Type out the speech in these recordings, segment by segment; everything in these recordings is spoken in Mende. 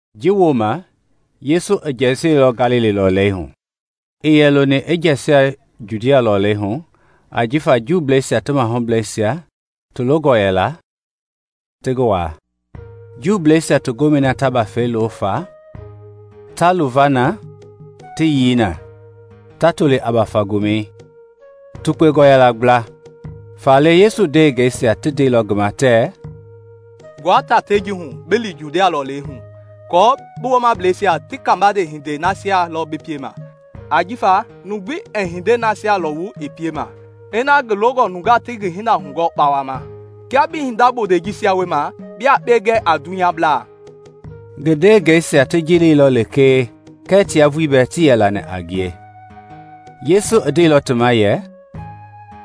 Ji wooma Yesu i jɛsiɛlɔ Galili lɔlei hu; ii yɛ loni i jɛsia Judia lɔlei hu ajifa Juuisia ti mahublɛisia ti longɔ yɛla ti ngi waa. Juuisia ti gomɛi na ta bafɛisia lo fa, ta luva na ta yii na, ta toli a Bafa Gomɛi, tukpengɔ yɛla kpla; faale Yesu ndewehingeisia ti ndeilɔ ngi ma tɛɛ, “Gbua tatei ji hu bi li Judia lɔlei hu aako bi woomableisia ti kabande hindei nasia lɔ bi piema. Ajifa numu gbi ɛɛ hindei nasia lɔwu i piema ina ngi longɔ nungaa ti ngi hinda hugɔɔ kpawama. Kia bi hinda bondei jisia wiema, bia yekpe gɛ a dunyabla.” Ngi ndewehingeisia ti ji leilɔ lekee kɛɛ tia vulii tii yɛ lani a ngie. Yesu ndeilɔ ti ma yɛ,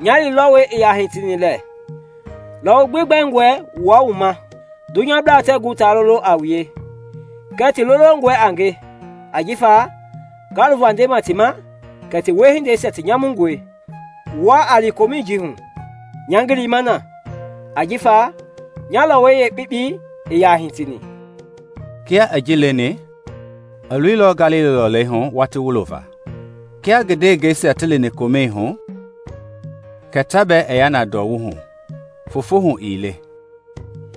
“Nya lilɔwɔi ii yaa hitini lɛ. Lɔwɔ gbi bɛngɔe wua wu ma. Dunyablaa tɛɛ gu ti lolo a wue, kɛɛ ti lolongɔe a nge ajifa nga luva ndema ti ma kɛ ti wiehindeisia ti nyamungɔe. Wua a li Komɛi ji hu; nya ngii lima na ajifa nya lɔwɔi yeekpekpei ii yaa hitini.” Kia i ji leni, i loilɔ Galili lɔlei hu watii wulo va. Kia ngi ndewehingeisia ti lini Komɛi hu, kɛ ta bɛɛ i ya na ndɔwu hu, foofo hu ii le.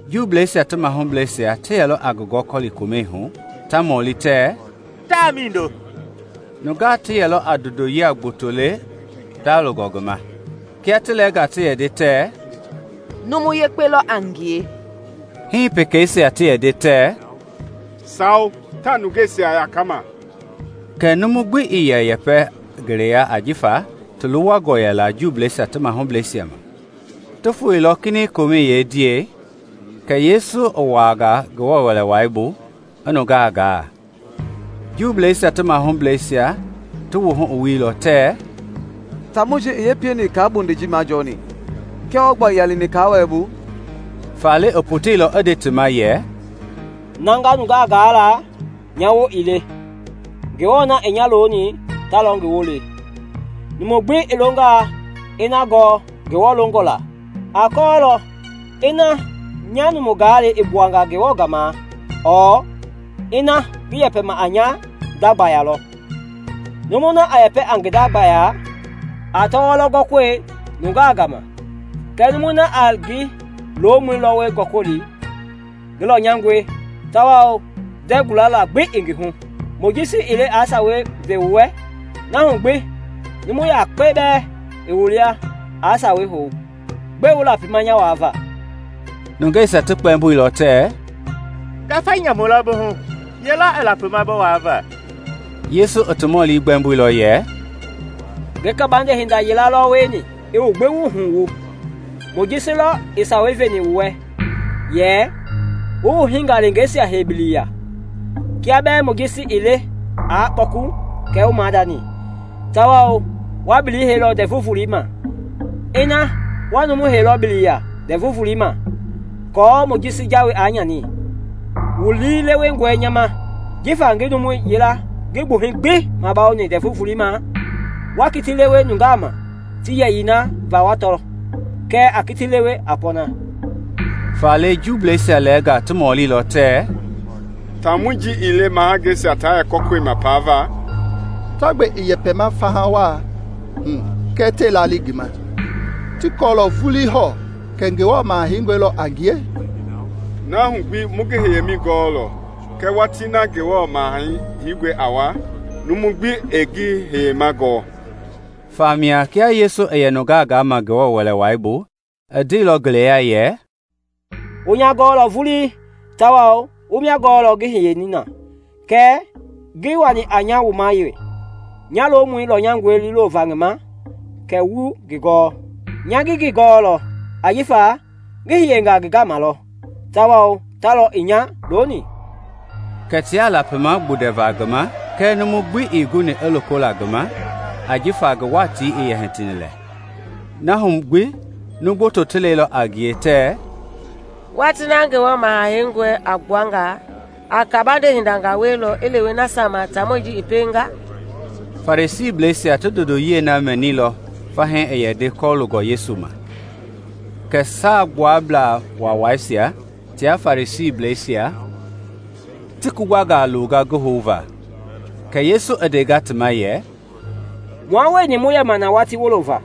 Juuisia ti mahublɛisia ti yɛlɔ a ngi gɔkɔli Komɛi hu, ta mɔli tɛɛ, “Taa mindo?” Nungaa ti yɛlɔ a ndondoyia gboto le ndalongɔ ngi ma. Kia ti lɛɛnga ti yɛ nde tɛɛ, “Numu yekpe lɔ a ngie,” hii pekeisia ti yɛ nde tɛɛ, “Sawo, taa nungeisia yakama.” Kɛɛ numu gbi ii yɛ ngi yɛpɛ le ngeleya ajifa ti luwangɔ yɛla Juuisia ti mahublɛisia ma. Ti foeilɔ kinɛiŋ Komɛi yeendiɛi Kɛ Yesu i wuaanga Ngewɔ Wɛlei bu i nungaa gaa. Juuisia ti mahublɛisia ti wuhu i wuilɔ tɛɛ, “Taamɔi ji i yee pieni i kaa bondei ji majɔɔni, kia wɔɔ gba ii yaa lini kaa-wɛlɛ bu?” Faale i poteilɔ i nde ti ma yɛ, “Na nga nungaa gaa la nya woo ii le; Ngewɔ na i nya loni ta lɔ ngi woo le; numu gbi i longaa i na gɔɔ Ngewɔ longɔ la, a kɔɔlɔ ina nya numu gaalɛi i gbuanga Ngewɔ gama lɔ ɔɔ ina ngi yɛpɛma a nya nda gbayei lɔ. Numui na a yɛpɛ a ngi nda gbayei a tɔwɔi lɔ gɔkɔli nungaa gama; kɛɛ numui na a ngi lomɔi lɔwɔi gɔkɔli ngi lɔnyangɔe tawao ndɛɛ gualala gbi ii ngi hu. Mojisi ii le aa Sawei ve wu wɛ? Na hu gbi numu yakpe bɛɛ ii wu lia aa Sawei hou. Gbɛe wu lapima nya waava?” Nungeisia ti kpɛmboilɔ tɛɛ, “Ngafa nyamu lɔ bi hu! Ye lɔ i lapima bi waava?” Yesu i ti mɔli gbɛmboilɔ yɛ, “Ngi kabande hinda yila lɔ wieni i wu gbi wuhu wu. Mojisi lɔ i Sawei veni wu wɛ yɛ wu wu hingaleengeisia hei biliya (kia bɛɛ Mojisi ii le aa kpɔku kɛ wu maadani), tawao wa bili heilɔ Ndɛvu Volei ma. Ina wa numu heilɔ bili ya Ndɛvu Volei ma aako Mojisi jawei aa nyani, wu lii lewengɔe nya ma jifa ngi numu yila ngi gbuhɛi gbi bawoni Ndɛvu Volei ma? Waa kiti lewe nungaa ma ti yɛyii na va wa tɔ, kɛɛ a kitii lewe a pɔɔna.” Faale Jelusalɛmblɛisia lɛɛnga ti ndeilɔ tɛɛ, “Taamɔi ji ii le mahangeisia ta yɛ kɔkɔlima paava? Ta gbe i yɛpɛma faha waa hu kɛɛ tɛɛ laali ngi ma! Ti kɔɔlɔ vulii hɔɔ kɛ Ngewɔ Maha Heingɔi lɔ a ngie? Na hu gbi mu ngi hiyemɛi gɔɔlɔ; kɛɛ watii na Ngewɔ Maha Heingɔi a wa, numu gbi ɛɛ ngi hiyemɛi gɔɔ.” Famia kia Yesu i yɛ nungaa gama Ngewɔ Wɛlei bu i ndeilɔ ngeleya yɛ, “Wu nya gɔɔlɔ vulii, tawao wu mia gɔɔlɔ ngi hiyeni na. Kɛɛ ngii wani a nya wuma wee; nya lomɔi lɔnyangɔe liilova ngi ma kɛɛ wuii ngi gɔɔ. Nya ngi ngi gɔɔlɔ, ajifa ngi hiyenga ngi gama lɔ, tawao ta lɔ i nya loni.” Kɛ tiaa lapima gbundɛva ngi ma kɛɛ numu gbi ii guni aa loko la ngi ma ajifa ngi watii ii yɛ hitini lɛ. Na hu gbi numu gboto ti lɛilɔ a ngie tɛɛ, “Watii na Ngewɔ Maha Heingɔi a gbua nga, a kabande hindangaa wielɔ i lewe nasia ma taamɔi ji i pienga?” Farisiisia ti ndondoyiɛi na mɛnilɔ fahii i yɛ nde kɔlooni Yesu ma, kɛ Saagbuablaa Waawaisia tia Farisiisia ti kugbangaa longa ngi houva. Kɛ Yesu i ndenga yɛ, “Mua wueni mu yɛmaa na watii wulo va,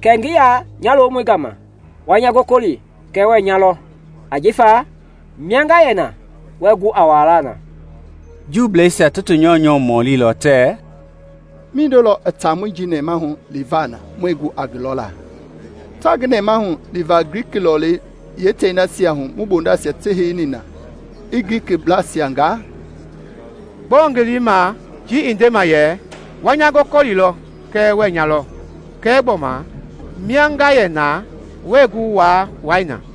kɛ ngi ya nya lomɔi gama; wa nya gɔkɔlilɔ kɛɛ wɛɛ nya lɔ ajifa mia nga yɛ na wɛɛ gu a wuala na.” Juuisia ti mahublɛisia ti ti nyɔunyɔ mɔlilɔ tɛɛ, “Mindo lɔ i taamɔi ji nɛmahu liva na muɛɛ gu a ngi lɔla? Taa ngi nɛmahu liva Gliki lɔlei yeetei nasia hu mu bondeisia ti heini na i Glikiblɛisia gaa? Gbɔɔ ngi lii i ma ji i ndema yɛ. ‘Wa nya gɔkɔlilɔ kɛɛ wɛɛ nya lɔ’ kɛɛ gbɔma, ‘mia nga yɛ na wɛɛ gu waa wua na?’”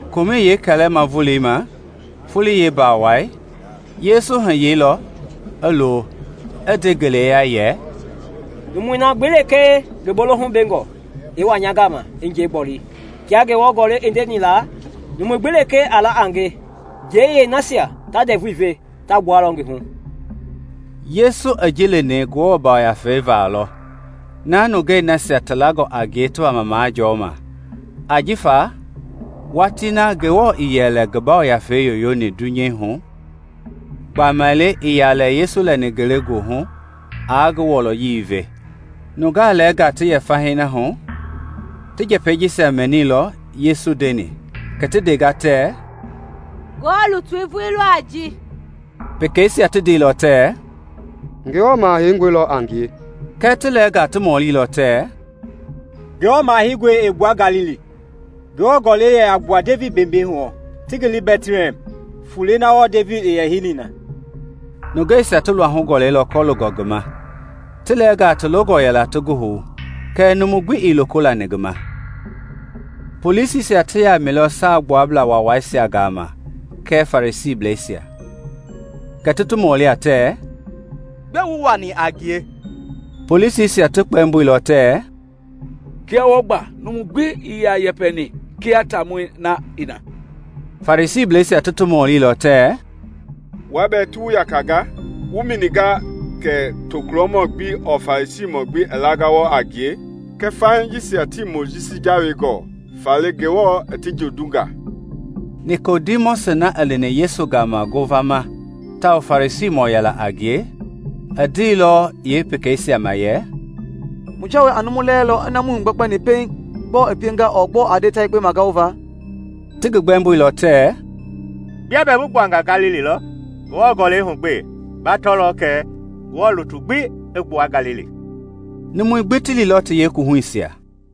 Komɛi yeekɛlɛma volei ma, foloi yeembawai, Yesu i hiyeilɔ, i lo, i nde ngeleya yɛ, “Numui na gbi lekee ngi bolohu bengɔ, i wa nya gama i njɛi gboli. Kia Ngewɔ Gɔlɛi i ndeni la, numu gbi lekee a la a nge, njeiyɛi nasia ta ndɛvui ve ta gbualɔ ngi hu.” Yesu i ji leni Ngewɔ Yafei va lɔ, na nungei nasia ti langɔ a ngie ti wama majɔɔma; ajifa watii na Ngewɔ ii yɛ lɛ ngi Yafei yoyoni dunyei hu gbamaile ii yɛ lɛ Yesu lɛni ngelegoohu aa ngi wɔlɔyei ve. Nungaa lɛɛnga ti yɛ fahii na hu ti njɛpɛi jisia mɛnilɔ Yesu i ndeni kɛ ti ndenga tɛɛ, “Ngewɔ lutui vulii lɔ a ji.” Pekeisia ti ndeilɔ tɛɛ, “Ngewɔ Maha Heingɔi lɔ a ngie.” Kɛɛ ti lɛɛnga ti mɔlilɔ tɛɛ, “Ngewɔ Maha Heingɔi ɛɛ gbua Galili. Ngewɔ Gɔlɛi yɛ a gbua Devidi beembee hu lɔ, ti ngi le Bɛtlihɛm, fulei na wɔɔ Devidi i yɛ heini na.” Nungeisia ti luahu i gɔlɛilɔ kɔloongɔ ngi ma. Ti lɛɛnga ti longɔ yɛla ti ngi hou, kɛɛ numu gbi ii loko lani ngi ma. Polisisia ti yamɛilɔ Saagbuablaa Waawaisia gama kɛɛ Farisiisia. Kɛ ti ti mɔlinga tɛɛ, “Gbɛe wuii wani a ngie?” Polisisia ti kpɛmboilɔ tɛɛ, “Kia wɔɔ gba numu gbi ii yaa yɛpɛni kia taamɔi na i na!” Farisiisia ti ti mɔlilɔ tɛɛ, “Wua bɛɛ ti wu yakanga? Wu mɛninga kɛ tokulɔ gbi ɔɔ Farisiimɔ i langa wɔɔ gba a ngie? Kɛɛ fahii jisia tii Mojisi jawei gɔɔ faale Ngewɔ i ti jondunga.” Nikodimɔsi na i lini Yesu gama ngovama tawao Farisiisia yilayee a ngie, i ndeilɔ pekeisia ma yɛ, “Mu jawei a numu lɛɛlɔ ina muii hugbɛkpɛni pɛiŋ gbɔɔ i pienga ɔɔ gbɔɔ a nde ta yekpe magaova?” Ti kpɛmboilɔ tɛɛ, “Bia bɛɛ bi gbuanga Galili lɔ? Ngewɔ Gɔlɛi hugbee, ba tɔlɔ kɛ Ngewɔ lutu gbi ɛɛ gu i gbua Galili.” [ Numui gbi ti liilɔ ti yeekuwuhuisia.